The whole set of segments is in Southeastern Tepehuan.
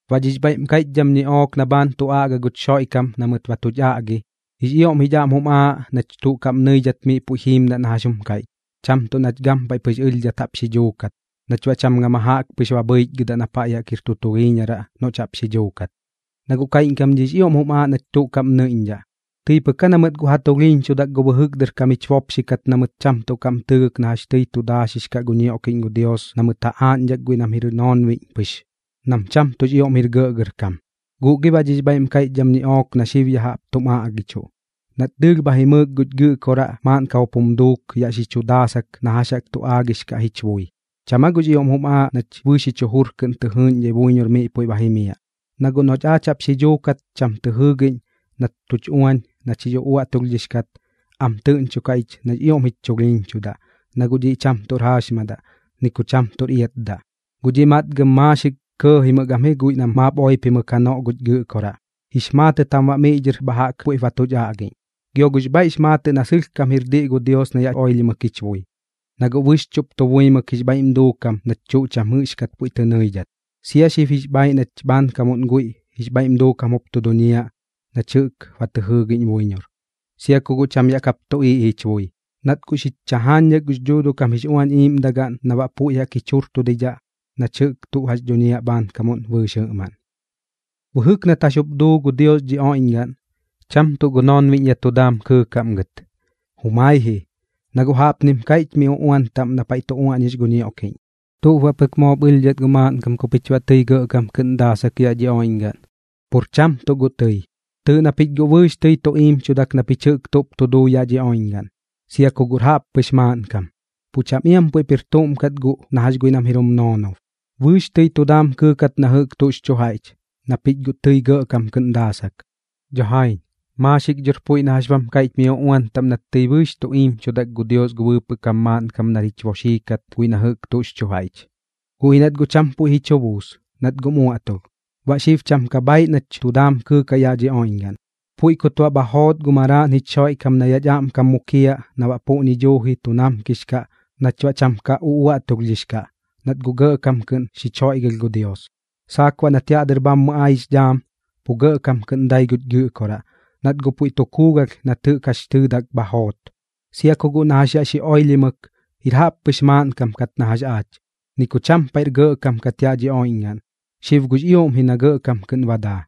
Baꞌ dhix bhaiꞌm kaiꞌchdham ñiꞌook na bhaan tu aꞌga guch Xoiꞌkam na mɨt ba tuch aꞌgi, jix ioꞌm jich aꞌm jum aaꞌ nach tuꞌ kaꞌm nɨidhat miꞌ puiꞌ jiimdaꞌ na jax jum kaiꞌch, cham tuꞌ nach gampaiꞌ pɨx ɨlhdhat jaꞌp xi dhuukat, nach baꞌ cham gama jaꞌk pɨx bhɨichgɨdaꞌ na paiꞌ jaꞌk jir tu tulhiiñaraꞌ noꞌch jaꞌp xi dhuukat. Na guꞌ kaiꞌñkam dhiꞌx ioꞌm jum aaꞌ nach tuꞌ kaꞌm nɨiꞌñdhaꞌ, tɨi pɨk aa na mɨt guꞌ ja tulhiiñchudak gu bɨjɨk dɨr kam jich bopxi kat na mɨt cham tuꞌ kaꞌm tɨɨgɨk na jax tɨi tu daaxix kaꞌ gu ñioꞌkiꞌñ gu Dios na mɨt ja aaꞌñdhak guiꞌ nam jir noonbiꞌñ pɨx, nam cham tuꞌx ioꞌm jir gɇꞌgɇrkam. Guꞌ gi baꞌ dhix bhaiꞌm kaiꞌchdham ñiꞌook na xib ya jaꞌp tum aꞌgichuꞌ, nat dɨɨlh bha jimɨɨk guch Gɨꞌkoraꞌ maaꞌnkam jup jum duuk yaꞌ xi chu daasak na jax jaꞌk tu aagix kaꞌ jich bui, ¿cham aa guꞌx ioꞌm jum aaꞌ nach bɨɨx jich jujur kɨꞌn tɨ jɨɨꞌñdhai buiñor miꞌ puiꞌ ba jimiaꞌ? Na guꞌ noꞌch aach jaꞌp xi dhuukat cham tɨ jɨɨgiꞌñ nat tuch uañ nach jix uꞌuaꞌtulhdhix kat, am tɨꞌñchokaꞌ ich nax ioꞌm jich chulhiiñchudaꞌ, na guꞌ dhiꞌ cham tuꞌr jaaxmadaꞌ, ni ku cham tuꞌr iatdaꞌ. Guꞌ dhiꞌ matgam maaxik kɇɇjimɨk am ji guiꞌ nam maap oipimɨk janoꞌ guch Gɨꞌkoraꞌ, jix maatɨt jam baꞌ miꞌ dhɨr bha jaꞌk puiꞌp ba tuch aꞌgiꞌñ. Gio guꞌx bhaiꞌx maatɨꞌ na sɨlhkam jir diꞌ gu Dios na yaꞌ oilhimɨk jich bui, na guꞌ bɨxchuꞌp tu buimɨk jix bhaiꞌm duukam nach tuꞌ cham jɨꞌxkat puiꞌ tɨ nɨidhat. Sia xib jix bhaaiꞌ nach bhaankamuꞌn guiꞌ jix bhaiꞌm duukam jup tu duñiaꞌ nach jɨꞌk ba tɨ jɨɨgiꞌñ buiñor, sia ku cham yaꞌ kap tuꞌiiꞌ jich bui, nat guꞌ xich chajaañdhak gux Dhuuduꞌ kam jix Uañ Iiꞌmdagaꞌn na baꞌ puiꞌ jaꞌk jich jurtudidhaꞌ nach jɨꞌk tuꞌ jax dhuñiaꞌ bhaankamuꞌn bɨɨx jɨꞌmaꞌn. Bɨjɨk nat jax jup duu gu Dios dhi oiꞌñgaꞌn, cham tuꞌ gu noonbiꞌñ yaꞌ tu daam kɨɨkaꞌm gɨt. Jumai ji, na guꞌ jaꞌpnim kaiꞌch miꞌ paiꞌ uꞌuan taꞌm na tu uaꞌñix gu ñioꞌkiꞌñ: ¿Tuꞌp baꞌ pɨk moop ɨlhdhat gu maaꞌnkam ku pich baꞌ tɨi gɇꞌkam kɨꞌn daasak yaꞌ dhi oiꞌñgaꞌn? Pur cham tuꞌ guꞌ tɨi. Tɨɨꞌ na pich guꞌ bɨɨx tɨi tu iimchudak na pich jɨꞌk tuꞌp tu duu yaꞌ dhi oiꞌñgaꞌn, sia ku guꞌr jaꞌppɨx maaꞌnkam, pu cham iam puiꞌp jir tuꞌm kat guꞌ na jax guiꞌ nam jir jum noonob. Bɨɨx tɨi tu daam kɨɨkat na jɨꞌk tuꞌx chu jaiꞌch, na pich guꞌ tɨi gɇꞌkam kɨꞌn daasak. Dho jaiñ, maaxik dhor puiꞌ na jax bam kaiꞌch mi uꞌuan taꞌm nat tɨi bɨɨx tu iimchudak gu Dios gu bɨɨpɨꞌ kam maaꞌnkam nar jich boxii kat guiꞌ na jɨꞌk tuꞌx chu jaiꞌch. Guꞌ ji nat guꞌ cham puiꞌ ji chu buus, nat guꞌm uaꞌtulh. Baꞌ xib cham ka bhaaiꞌ nach tu daam kɨɨkaꞌ yaꞌ dhi oiꞌñgaꞌn. Puiꞌ kut baꞌ bha joot gu Maraaꞌn jich Xoiꞌkam na yaꞌch aꞌmkam mukiaꞌ na baꞌ puꞌñi duuji tu namkix kaꞌ nach baꞌ cham ka uꞌuaꞌtulhdhix kaꞌ, nat guꞌ gɇꞌkam kɨꞌn xich joiꞌgɨlh gu Dios. Saak baꞌ nat yaꞌ dɨr bhammɨ ai jix dhaam, pu gɇꞌkam kɨꞌn dai guch Gɨꞌkoraꞌ, nat guꞌ puiꞌ tu kuugalh nat jɨꞌk jax tɨɨdak bha joot. Sia ku guꞌ na jax yaꞌ xi oilhimɨk, jir jaꞌppɨx maaꞌnkam kat na jax aach, ni ku cham paiꞌr gɇꞌkam kat yaꞌ dhi oiꞌñgaꞌn, xib guꞌx ioꞌm ji na gɇꞌkam kɨꞌn ba daa.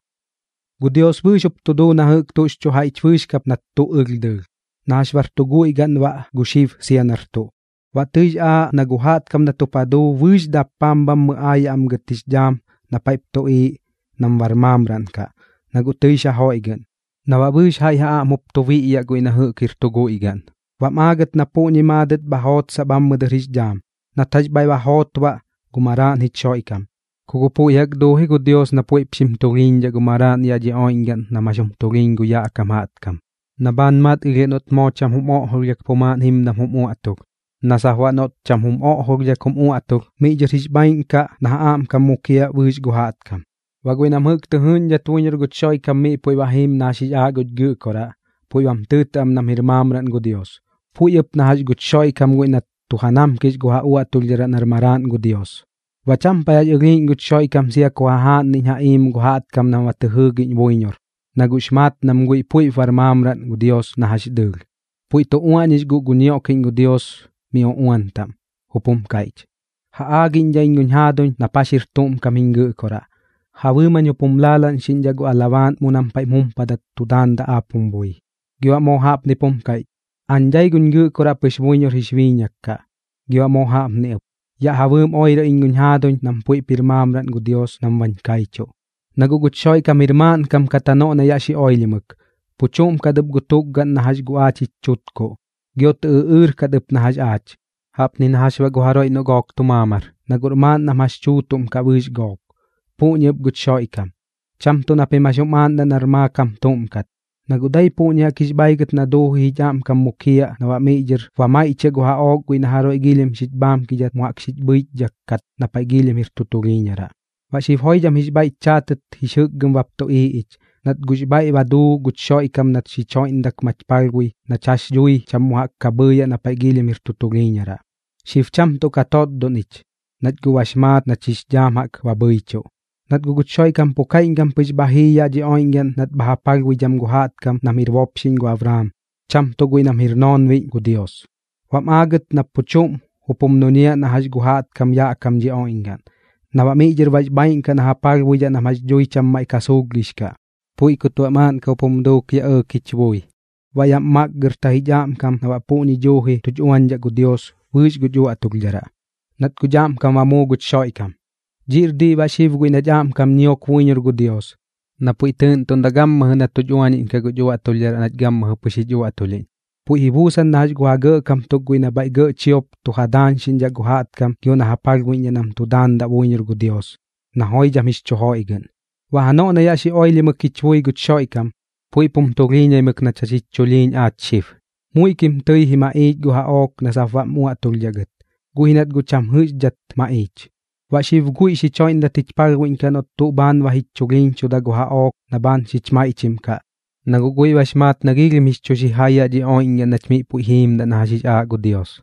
Gu Dios bɨɨx jup tu duu na jɨꞌk tuꞌx chu jaiꞌch bɨɨx kap nat tuꞌ ɨlh dɨɨlh, na jax bar tu guiꞌ gaꞌn baꞌ gu xib sia nar tuꞌ. Baꞌ tɨix aaꞌ na gu jaꞌtkam nat jup ja duu bɨɨx dappaam bhammɨ aayaꞌ am gɨt jix dhaam na paiꞌp tuꞌiiꞌ nam bar maamraꞌn kaꞌ, na guꞌ tɨix ja joiꞌgɨꞌn, na baꞌ bɨɨx jaiꞌ ja aꞌm jup tu biꞌyaꞌ guiꞌ na jɨꞌk jir tu guiꞌ gaꞌn. Baꞌm aagat na puꞌñi maadɨt bha jootsaꞌ bhammɨ dɨr jix dhaam, nat jax bhaiꞌ ba joot baꞌ gu Maraaꞌn jich Xoiꞌkam. Ku guꞌ puiꞌ jaꞌk duuji gu Dios na puiꞌp xim tulhiiñdhaꞌ gu Maraaꞌn yaꞌ dhi oiꞌñgaꞌn nam jax jum tulhiiñ gu yaꞌ kam jaꞌtkam, na bhaan matgilhiaꞌ noꞌt moo cham jum oꞌjolhdhak pu maaꞌn jimdam jum uaꞌtulh, na sap baꞌ noꞌt cham jum oꞌjolhdhak jum uaꞌtulh, miꞌ dhɨr jix bhaaiꞌn kaꞌ na ja aꞌmkam mukiaꞌ bɨɨx gu jaꞌtkam. Baꞌ guiꞌ nam jɨꞌk tɨ jɨɨꞌñdhat buiñor guch Xoiꞌkam miꞌ puiꞌ ba jiim na jax jix aaꞌ guch Gɨꞌkoraꞌ, puiꞌ bam tɨɨtɨꞌ am nam jir maamraꞌn gu Dios, puiꞌ ɨp na jax guch Xoiꞌkam guiꞌ nat tu ja namkix gu ja uaꞌtulhdharaꞌ nar Maraaꞌn gu Dios. Baꞌ cham paiꞌ jax ɨlhiiꞌñ guch Xoiꞌkam sia ku jajaaꞌnniꞌñ ja iim gu jaꞌtkam nam ba tɨ jɨɨgiꞌñ buiñor, na guꞌx maat nam guiꞌ puiꞌp bar maamraꞌn gu Dios na jax dɨɨlh. Puiꞌ tu uaꞌñix guꞌ gu ñioꞌkiꞌñ gu Dios mi uꞌuan taꞌm, jup jum kaiꞌch: Ja aagiꞌñdhaꞌ iñ guñ jaaduñ nap jax jir tuꞌm kam jiñ Gɨꞌkoraꞌ, ja bɨɨm jañ jup jum laalaꞌñxiꞌñdhaꞌ gu alabaaꞌn mu nam paiꞌm jumpadat tu daandaꞌ aap jum bui. Gio baꞌ moo jaꞌpnip jum kaiꞌch: Aañ dai guñ Gɨꞌkoraꞌ pɨx buiñor jix biiñak kaꞌ. Gio baꞌ moo jaꞌpni ɨp: Yaꞌ ja bɨɨm oirɨ iñ guñ jaaduñ nam puiꞌp jir maamraꞌn gu Dios nam bañ kaichuꞌ. Na guꞌ guch Xoiꞌkam jir maaꞌnkam kat janoꞌ na yaꞌ xi oilhimɨk, pu chuꞌm kat ɨp gu tukgaꞌn na jax gu aach jich chutkuꞌ, gio tɨ ɨꞌɨɨr kat ɨp na jax aach. Jaꞌpni na jax baꞌ gu jaroiꞌ noꞌ gook tu maamar, na guꞌr maaꞌn nam jax chuutuꞌm kaꞌ bɨɨx gook, puꞌñi ɨp guch Xoiꞌkam. Cham tuꞌ na pim jax jum aaꞌndaꞌ nar maakam tuꞌm kat, na guꞌ dai puꞌñi jaꞌk jix bhaigɨt na duuji jich aꞌmkam mukiaꞌ na baꞌ miꞌ dhɨr ba maiꞌchiaꞌ gu jaꞌook guiꞌ na jaroiꞌ giilhim xich bhaamkidhat mu jaꞌk xich bhɨichdhak kat na paiꞌ giilhim jir tu tulhiiñaraꞌ. Baꞌ xib joidham jix bhaiꞌch chaatɨt jix jɨkgɨm bap tuꞌiiꞌ ich, nat guꞌx bhaiꞌ ba duu guch Xoiꞌkam nat xich joiꞌndak mach palhbui nach jax dhui cham mu jaꞌk ka bhɨɨyaꞌ na paiꞌ giilhim jir tu tulhiiñaraꞌ. Xib cham tuꞌ ka totdon ich, nach guꞌ bax maat nach jix dhaam jaꞌk ba bhɨichuꞌ. Nat guꞌ guch Xoiꞌkam pu kaiꞌñkam pɨx bha jii yaꞌ dhi oiꞌñgaꞌn nat bha ja palhbuidham gu jaꞌtkam nam jir bopxiꞌñ gu Abraam, cham tuꞌ guiꞌ nam jir noonbiꞌñ gu Dios. Baꞌm aagɨt na pu chuꞌm jup jum duñiaꞌ na jax gu jaꞌtkam yaꞌ kam dhi oiꞌñgaꞌn, na baꞌ miꞌ dhɨr bax bhaaiꞌn kaꞌ na ja palhbuidhaꞌ nam jax dhui cham maiꞌ ka suulhgix kaꞌ. Puiꞌ kut baꞌ maaꞌnkam jup jum duuk yaꞌ ɇɇk jich bui, baꞌ yaꞌm makgɨrta jich aꞌmkam na baꞌ puꞌñi duuji tuch uañdhaꞌ gu Dios bɨɨx guch uaꞌtulhdharaꞌ, nat guꞌch aꞌmkam ba muu guch Xoiꞌkam. Dhiꞌr diꞌ baꞌ xib guiꞌ nach aꞌmkam ñiok buiñor gu Dios, na puiꞌ tɨɨꞌntuꞌndaꞌ gammɨjɨ na tuch uañiꞌñkaꞌ guch uaꞌtulhdharaꞌ nach gammɨjɨ pɨx jich uaꞌtulhiꞌñ. Puiꞌ ji buusan na jax gu ja gɇꞌkam tuk guiꞌ nam bhaiꞌ gɇꞌ chiop tu ja daañxiꞌñdhaꞌ gu jaꞌtkam gio nam ja palhbuiꞌñdhaꞌ nam tu daandaꞌ buiñor gu Dios, na joidham jix chu joiꞌgɨꞌn. Baꞌ janoꞌ na yaꞌ xi oilhimɨk jich bui guch Xoiꞌkam, puiꞌp jum tulhiiñaimɨk nach jax jich chulhiiñ aach xib. Muiꞌkim tɨi ji maꞌiich gu jaꞌook na sap baꞌm uaꞌtulhdhaꞌ gɨt, guꞌ ji nat guꞌ cham jɨꞌxdhat maꞌiich. Baꞌ xib guiꞌ xich joiꞌndat jich palhbuiꞌñkaꞌ noꞌt tuꞌ bhaan ba jich chulhiiñchuda gu jaꞌook na bhaan xich maiꞌchim kaꞌ, na guꞌ guiꞌ bax maat na giilhim jix chu xijai yaꞌ dhi oiꞌñgaꞌn nach miꞌ puiꞌ jiimdaꞌ na jax jix aaꞌ gu Dios.